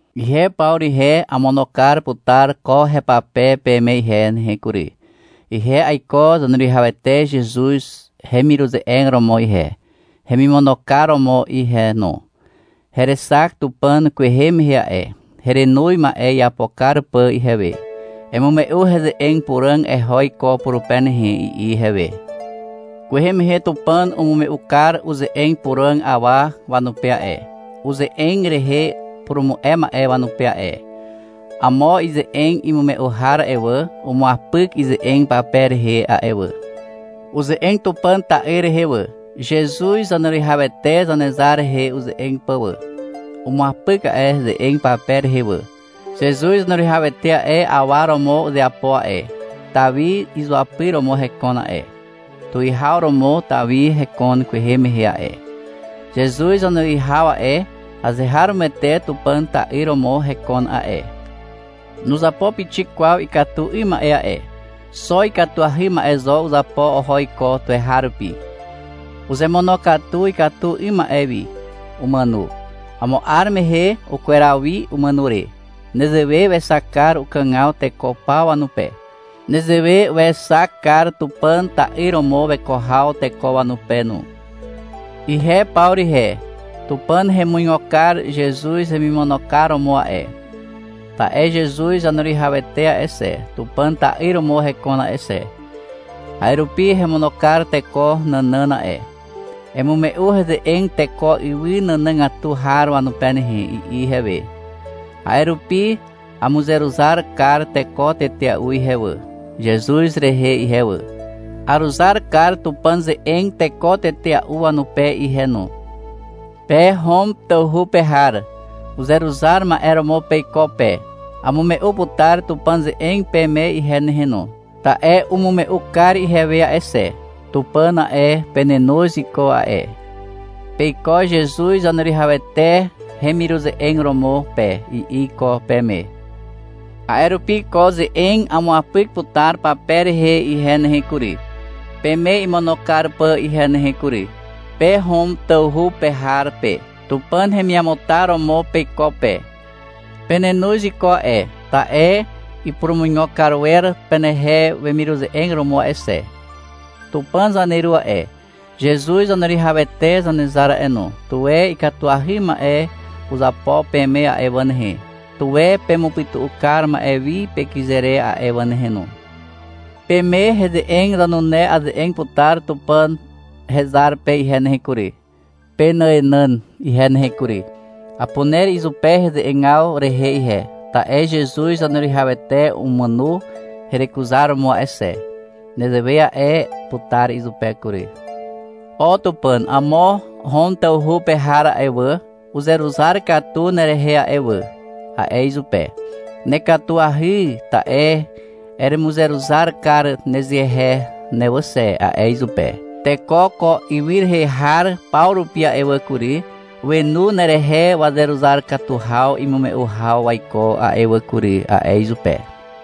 Ihe Pawru ihe, amono kar putar ko hepape peme ihe nehe kury. Ihe aiko Zaneruwihawete Zezuz hemiruze'eg romo ihe, hemimono kar romo ihe no. Herexak Tupàn kwehe mehe a'e. Herenoz ma'e iapo kar pà ihewe. — Emume'u heze'eg puràg eho iko purupe nehe, i'i ihewe. Kwehe mehe Tupàn umume'u kar uze'eg puràg awa wanupe a'e, uze'eg rehe purumu'e ma'e wanupe a'e. Amo ize'eg imume'u har a'e wà, umuapyk ize'eg pape rehe a'e wà. Uze'eg Tupàn ta'yr rehe wà, Zezuz Zaneruwihawete Zanezar rehe uze'eg pà wà. Umuapyk a'e ze'eg pape rehe wà. Zezuz Zaneruwihawete a'e, awa romo uzeapo a'e, Tawi izuapyr romo hekon a'e. Tuwihaw romo Tawi hekon kwehe mehe a'e. Zezuz Zaneruwihaw a'e, azeharomoete Tupàn ta'yr romo hekon a'e. Nuzapo pixik kwaw ikatu 'ym ma'e a'e. Xo ikatuahy ma'e zo uzapo oho iko tuweharupi. Uzemonokatu ikatu 'ym ma'e wi. Umàno. Amo 'ar mehe ukweraw wi umàno re. Nezewe wexak kar ukàgaw teko paw wanupe. Nezewe wexak kar Tupàn ta'yr romo weko haw teko wanupe no. Ihe Pawru ihe, Tupàn hemuigo kar Zezuz hemimono kar romo a'e. Ta'e Zezuz Zaneruwihawete a'e xe, Tupàn ta'yr romo hekon a'e xe. A'e rupi hemono kar teko nànàn a'e. — Emume'u heze'eg teko ywy nànàgatu har wanupe nehe, i'i ihewe. A'e rupi amuzeruzar kar teko tetea'u ihe wà, Zezuz rehe ihe wà. Aruzar kar Tupàn ze'eg teko tetea'u wanupe ihe no. Pe Hom tawhu pe har uzeruzar ma'e romo peiko pe. Amume'u putar Tupàn ze'eg peme ihe nehe no, ta'e umume'u kar ihewe a'e xe. Tupàn a'e, penenoz iko a'e. — Peiko Zezuz Zaneruwihawete hemiruze'eg romo pe, i'i iko peme. A'e rupi ko ze'eg amuapyk putar pape rehe ihe nehe kury, peme imono kar pà ihe nehe kury. Pe Hom tawhu pe har pe, Tupàn hemiamutar romo peiko pe. Penenoz iko a'e, ta'e ipurumuigo kar wer penehe wemiruze'eg romo a'e xe. Tupàn zaneru a'e, Zezuz Zaneruwihawete Zanezar a'e no, tuwe ikatuahy ma'e uzapo peme a'e wà nehe, tuwe pemupytu'u kar ma'e wi pekyze re a'e wà nehe no. Peme heze'eg zanune aze'eg putar Tupàn hezar pe ihe nehe kury, penàenàn ihe nehe kury. Apuner izupe heze'egaw rehe ihe, ta'e Zezuz Zaneruwihawete umàno herekuzar romo a'e xe. Nezewe a'e putar izupe kury. — O Tupàn, amo Hom tawhu pe har a'e wà, uzeruzar katu nerehe a'e wà, a'e izupe. — Nekatuahy, ta'e eremuzeruzar kar nezehe ne wà xe, a'e izupe. — Teko ko ywy rehe har paw rupi a'e wà kury, wenu nerehe wazeruzar katu haw imume'u haw waiko a'e wà kury, a'e izupe.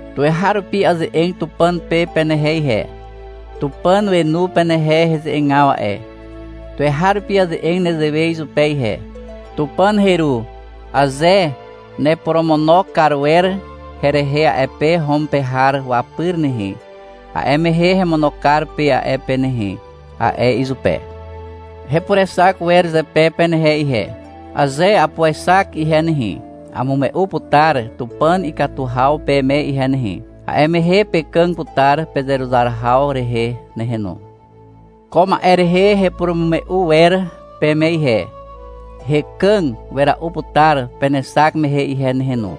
Tuweharupi aze'eg Tupàn pe penehe ihe. Tupàn wenu penehe heze'egaw a'e. Tuweharupi aze'eg nezewe izupe ihe. — Tupàn heru, aze neporomono kar wer herehe a'e pe Hom pe har wapyr nehe, a'e mehe hemono kar pe a'e pe nehe, a'e izupe. Hepurexak wer zepe penehe ihe. Aze apuexak ihe nehe, amume'u putar Tupàn ikatu haw peme ihe nehe. A'e mehe pekàg putar pezeruzar haw rehe nehe no. Ko ma'e rehe hepurumume'u wer peme ihe. — Hekàg wera'u putar penexak mehe ihe nehe no,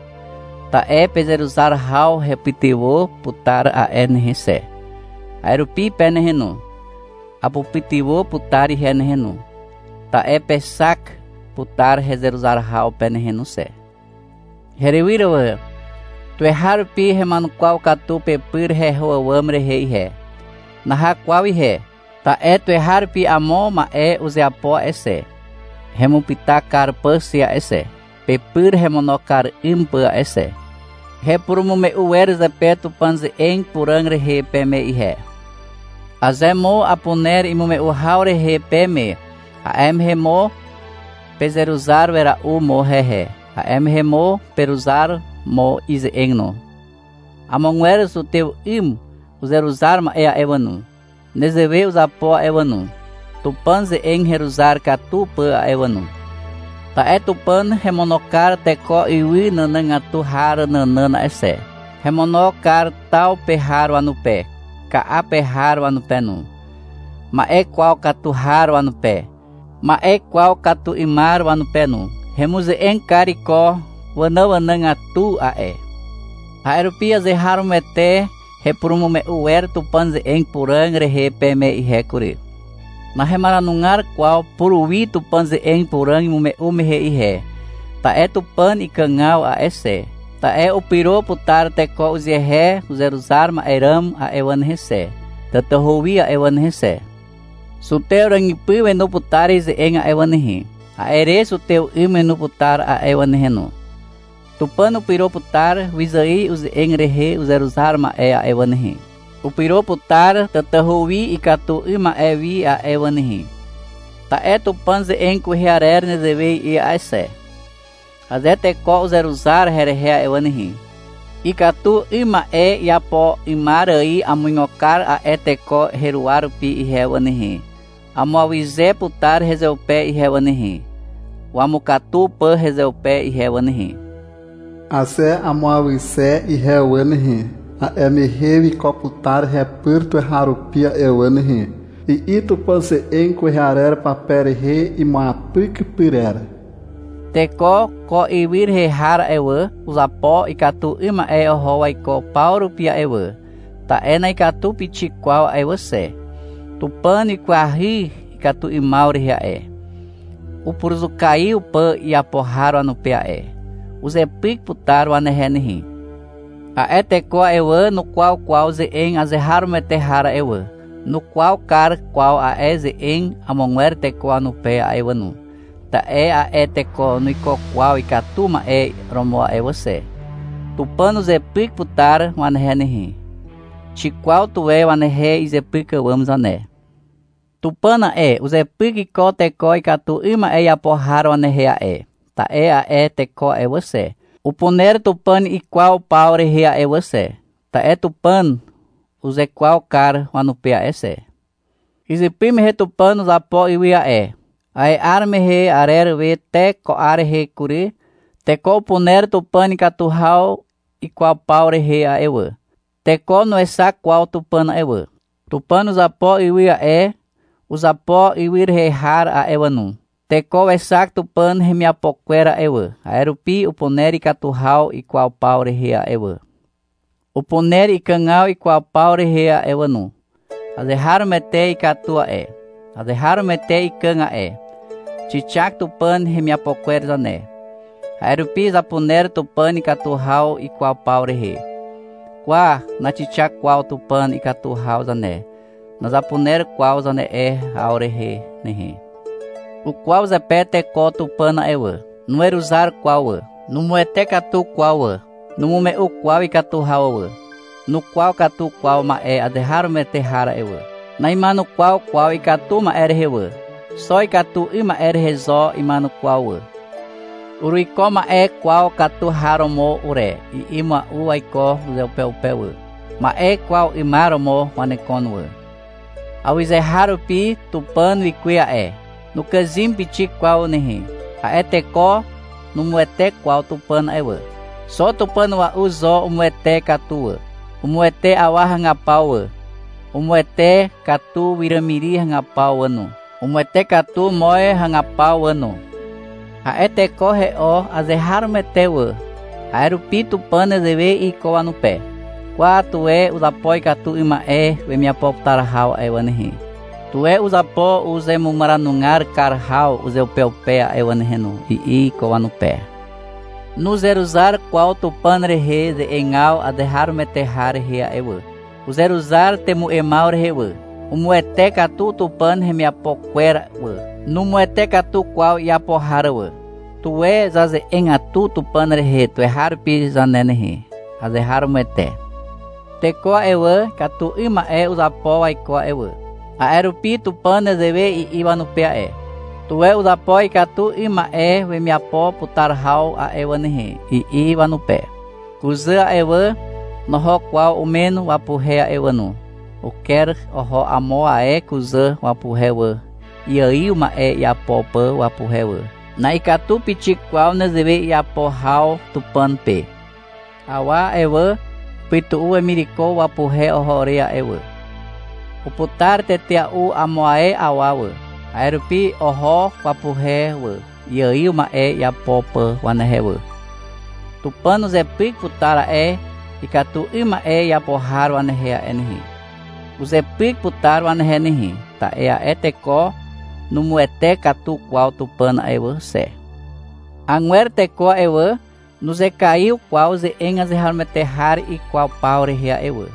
ta'e pezeruzar haw hepytywà putar a'e nehe xe. A'e rupi pe nehe no. Apupytywà putar ihe nehe no, ta'e pexak putar hezeruzar haw pe nehe no xe. Herywyr wà, tuweharupi hema'enukwaw katu pepyr heho àwàm rehe ihe. Naha kwaw ihe. Ta'e tuweharupi amo ma'e uzeapo a'e xe, hemupyta kar pà xe a'e xe, pepyr hemono kar 'ym pà a'e xe. Hepurumume'u wer zepe Tupàn ze'eg puràg rehe peme ihe. Aze mo apuner imume'u haw rehe peme, a'e mehe mo pezeruzar wera'u mo hehe, a'e mehe mo peruzar mo ize'eg no. Amogwer zutew 'ym uzeruzar ma'e a'e wà no, nezewe uzapo a'e wà no, Tupàn ze'eg heruzar katu pà a'e wà no. Ta'e Tupàn hemono kar teko ywy nànàgatu har nànàn a'e xe. Hemono kar taw pe har wanupe, ka'a pe har wanupe no, ma'e kwaw katu har wanupe, ma'e kwaw katu 'ymar wanupe no. Hemuze'eg kar iko wanàanàgatu a'e. A'e rupi azeharomoete hepurumume'u wer Tupàn ze'eg puràg rehe peme ihe kury. Nahemaranugar kwaw puruwi Tupàn ze'eg puràg imume'u mehe ihe, ta'e Tupàn ikàgaw a'e xe, ta'e upyro putar teko uzehe uzeruzar ma'e ràm a'e wà nehe xe, tatahu wi a'e wà nehe xe. (Zutew ràgypy wenu putar ize'eg a'e wà nehe, a'e re zutew 'ym wenu putar a'e wà nehe no.) Tupàn upyro putar wyzài uze'eg rehe uzeruzar ma'e a'e wà nehe. Upyro putar tatahu wi ikatu 'ym ma'e wi a'e wà nehe. Ta'e Tupàn ze'eg kwehe arer nezewe i'i a'e xe. — Aze teko uzeruzar herehe a'e wà nehe, ikatu 'ym ma'e iapo 'ymar ài amuigo kar a'e teko heruwa rupi ihe wà nehe. Amuawyze putar hezeupe ihe wà nehe, wamukatu pà hezeupe ihe wà nehe. Aze amuawyze ihe wà nehe, a'e mehe wiko putar hepyr tuweharupi a'e wà nehe, i'i Tupàn ze'eg kwehe arer pape rehe imuapyk pyrer. Teko ko ywy rehe har a'e wà, uzapo ikatu 'ym ma'e oho waiko paw rupi a'e wà, ta'e na'ikatu pixik kwaw a'e wà xe. Tupàn wikwahy ikatu 'ymaw rehe a'e, upuruzukaiw pà iapo har wanupe a'e. Uzepyk putar wanehe nehe. A'e teko a'e wà, nukwaw kwaw ze'eg azeharomoete har a'e wà, nukwaw kar kwaw a'e ze'eg amogwer teko wanupe a'e wà no, ta'e a'e teko nuiko kwaw ikatu ma'e romo a'e wà xe. Tupàn uzepyk putar wanehe nehe. Xikwaw tuwe wanehe izepyk àwàm zane. Tupàn a'e, uzepyk iko teko ikatu 'ym ma'e iapo har wanehe a'e. Ta'e a'e teko a'e wà xe, upuner Tupàn ikwaw paw rehe a'e wà xe, ta'e Tupàn uzekwaw kar wanupe a'e xe. Izypy mehe Tupàn uzapo ywy a'e. A'e 'ar mehe arer we te ko 'ar rehe kury, teko upuner Tupàn ikatu haw ikwaw paw rehe a'e wà. Teko nuexak kwaw Tupàn a'e wà. Tupàn uzapo ywy a'e, uzapo ywy rehe har a'e wà no. Teko wexak Tupàn hemiapo kwer a'e wà, a'e rupi upuner ikatu haw ikwaw paw rehe a'e wà. Upuner ikàgaw ikwaw paw rehe a'e wà no. Azeharomoete ikatu a'e. Azeharomoete ikàg a'e. Xixak Tupàn hemiapo kwer zane. A'e rupi zapuner Tupàn ikatu haw ikwaw paw rehe. — Kwa, naxikwaw kwaw Tupàn ikatu haw zane, nazapuner kwaw zane'e haw rehe nehe. Ukwaw zepe teko Tupàn a'e wà. Nuweruzar kwaw wà. Numuwete katu kwaw wà. Numume'u kwaw ikatu haw wà. Nukwaw katu kwaw ma'e azeharomoete har a'e wà. Na'ima'enukwaw kwaw ikatu ma'e rehe wà. Xo ikatu 'ym ma'e rehe zo ima'enukwaw wà. — Uruiko ma'e kwaw katu har romo ure, i'i mua'u waiko uzeupeupe wà. Ma'e kwaw 'ymar romo wanekon wà. Awyzeharupi Tupàn wikuwe a'e. Nukàzym pixik kwaw nehe. A'e teko numuwete kwaw Tupàn a'e wà. Xo Tupàn a'ua'u zo umuwete katu wà. Umuwete awa hagapaw wà. Umuwete katu wiràmiri hagapaw wà no, umuwete katu moz hagapaw wà no. A'e teko he'o azeharomoete wà, a'e rupi Tupàn nezewe i'i iko wanupe. — Kwa, tuwe uzapo ikatu 'ym ma'e wemiapo putar haw a'e wà nehe, tuwe uzapo uzemumaranugar kar haw uzeupeupe a'e wà nehe no, i'i iko wanupe. Nuzeruzar kwaw Tupàn rehe ze'egaw azeharomoete har rehe a'e wà. Uzeruzar temu'emaw rehe wà. Umuwete katu Tupàn hemiapo kwer wà. Numuwete katu kwaw iapo har wà. Tuwe zaze'egatu Tupàn rehe tuweharupi zane nehe. Azeharomoete. Teko a'e wà, ikatu 'ym ma'e uzapo waiko a'e wà. A'e rupi Tupàn nezewe i'i wanupe a'e. — Tuwe uzapo ikatu 'ym ma'e wemiapo putar haw a'e wà nehe, i'i wanupe. Kuzà a'e wà, noho kwaw umen wapuhe a'e wà no, uker oho amo ae kuzà wapuhe wà, iaiw ma'e iapo pà wapuhe wà. Na'ikatu pixik kwaw nezewe iapo haw Tupàn pe. Awa a'e wà, upytu'u wemireko wapuhe oho re a'e wà. Uputar tetea'u amo ae awa wà, a'e rupi oho wapuhe wà, iaiw ma'e iapo pà wanehe wà. Tupàn uzepyk putar a'e ikatu 'ym ma'e iapo har wanehe a'e nehe. Uzepyk putar wanehe nehe, ta'e a'e teko numuwete katu kwaw Tupàn a'e wà xe. Agwer teko a'e wà, nuzekaiw kwaw ze'eg azeharomoete har ikwaw paw rehe a'e wà.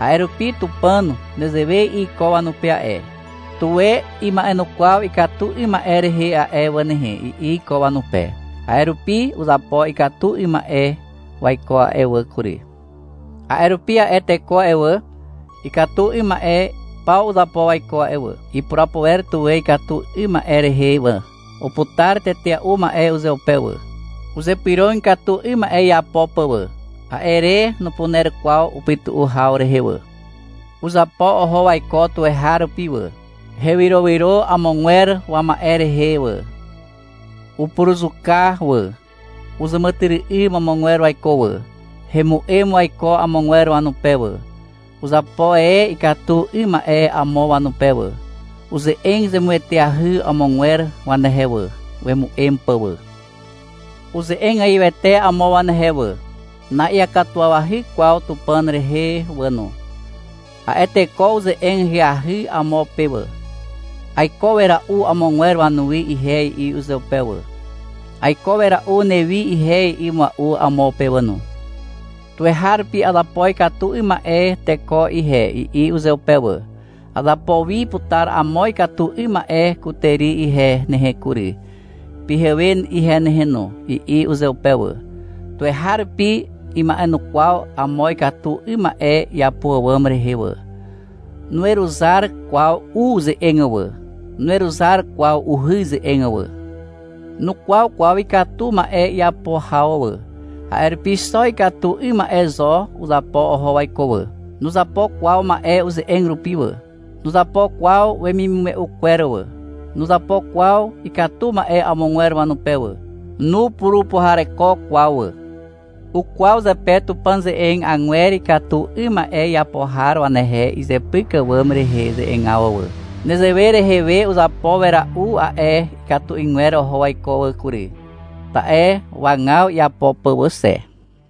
A'e rupi Tupàn nezewe i'i iko wanupe a'e. — Tuwe ima'enukwaw ikatu 'ym ma'e rehe a'e wà nehe, i'i iko wanupe. A'e rupi uzapo ikatu 'ym ma'e waiko a'e wà kury. A'e rupi a'e teko a'e wà, ikatu 'ym ma'e paw uzapo waiko a'e wà. Ipurapo wer tuwe ikatu 'ym ma'e rehe wà. Uputar tetea'u ma'e uzeupe wà. Uzypyrog ikatu 'ym ma'e iapo pà wà, a'e re nupuner kwaw upytu'u haw rehe wà. Uzapo oho waiko tuweharupi wà. Hewyrowyro amogwer wama'e rehe wà. Upuruzuka wà. Uzàmàtyry'ym amogwer waiko wà. Hemu'em waiko amogwer wanupe wà. Uzapo e ikatu 'ym ma'e amo wanupe wà. Uze'eg zemueteahy amogwer wanehe wà, wemu'em pà wà. Uze'egaiwete amo wanehe wà. Na'iakatuwawahy kwaw Tupàn rehe wà no. A'e teko uze'eg ahyahy amo pe wà. — Aiko wera'u amogwer wanuwi ihe, i'i uzeupe wà. — Aiko wera'u newi ihe, i'i mua'u amo pe wà no. — Tuweharupi azapo ikatu 'ym ma'e teko ihe, i'i uzeupe wà. — Azapo wi putar amo ikatu 'ym ma'e kutàri ihe nehe kury, pyhewe ihe nehe no, i'i uzeupe wà. Tuweharupi ima'enukwaw amo ikatu 'ym ma'e iapo àwàm rehe wà. Nuweruzar kwaw u ze'eg wà, nuweruzar kwaw uhy ze'eg wà. Nukwaw kwaw ikatu ma'e iapo haw wà, a'e rupi xo ikatu 'ym ma'e zo uzapo oho waiko wà. Nuzapo kwaw ma'e uze'eg rupi wà. Nuzapo kwaw wemimume'u kwer wà. Nuzapo kwaw ikatu ma'e amogwer wanupe wà. Nupurupuhareko kwaw wà. Ukwaw zepe Tupàn ze'eg agwer ikatu 'ym ma'e iapo har wanehe izepyk àwàm rehe ze'egaw wà. Nezewe rehe we uzapo wera'u a'e ikatu 'ygwer oho waiko wà kury. Ta'e wagaw iapo pà wà xe.